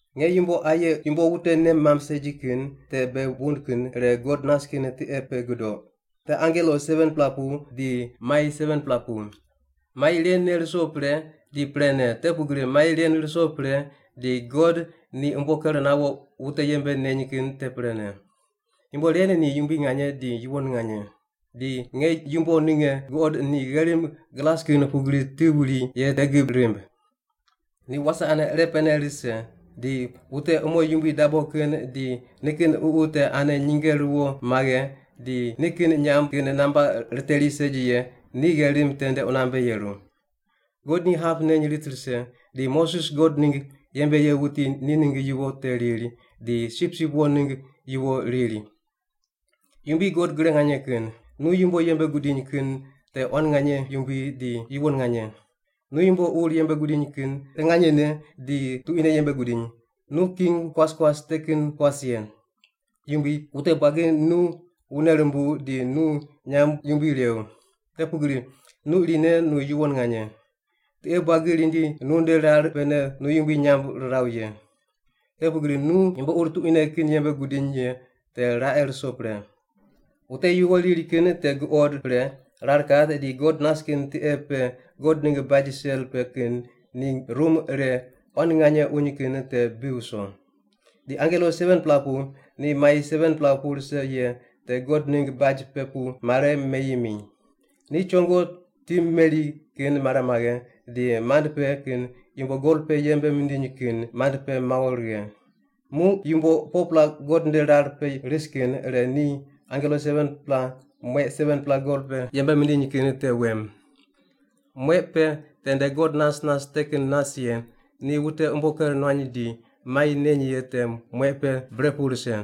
Nge yumbo aye yumbo wute nei mamb segi kin te bei wund kin ire God nas kin tiqe pe gudoq, te angelo 7-pela pu di mai 7-pela pu. Mai ren ne ruso pre di prene, te pugri mai ren ruso pre di God ni umbo ker nawo wute yembe neny kin te prene. Yumbo ren ni yumbui nganye di yuwon nganye. Di nge yumbo ninge guqod ni gherim glas kin pugri ti wuri ye te gib rimb. Ni wase ane irepene rise, di wute umo yumbui dabo kin di nikin ququ te ane nyinge ruwo maghe, di ni kin nyamb kin namba riteri segi ye ni gherim tende qunambe yeru. God ni hap neny rit rise, di Moses God ningg yembe ye wuti ni ningg yuwo te riri, di Sipsip Wo ningg yuwo riri: “Yumbui God Gre Nganye Kin, nu yumbo yembe gudiny kin te quan nganye yumbui di yuwon nganye. Nu yumbo ur yembe gudiny kin te nganyene di tuquine yembe gudiny, nu king kuas kuas te kin kuas ye. Yumbui, wute buagi nu wune rumbuw di nu nyamb yumbui rew. Te pugri nu irine nu yuwon nganye. Tiqe buagi rindi nunde rar pene nu yumbui nyamb riraw ye. Te pugri nu yumbo ur tuquine kin yembe gudiny ye te raqe ruso pre.” Wute yuwo riri kin te guqod pre, rar kat di God nas kin tiqe pe God ningg baj sel pe kin ni rum ire quan nganye uny kin te bi wuso. Di angelo 7-pela pu ni mai 7-pela pu rise ye te God ningg baj pe pu mare meyi mi. Ni chongo ti meri kin mare maghe di mand pe kin yumbo gol pe yembe mindiny kin mand pe mawo righe. Muq yumbo 4-pela God nde rar pe ris kin ire ni angelo 7-pela mueq 7-pela gol pe yembe mindiny kin te wem. Mueq pe tende God nas nas te kin nas ye ni wute umbo ker nuany di mai neny ye te mueq pe bre pu rise.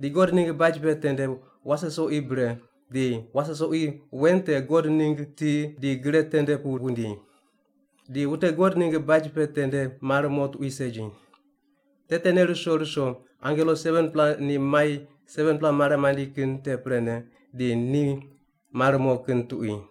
Di God ningg baj pe tende wase soqi bre, di wase soqi wen te God ningg ti di gre tende pu wundi. Di wute God ningg baj pe tende mar mo tuqui segi. Te tene ruso ruso angelo 7-pela ni mai 7-pela mare mandi kin te prene, di ni mar mo kin tuqui.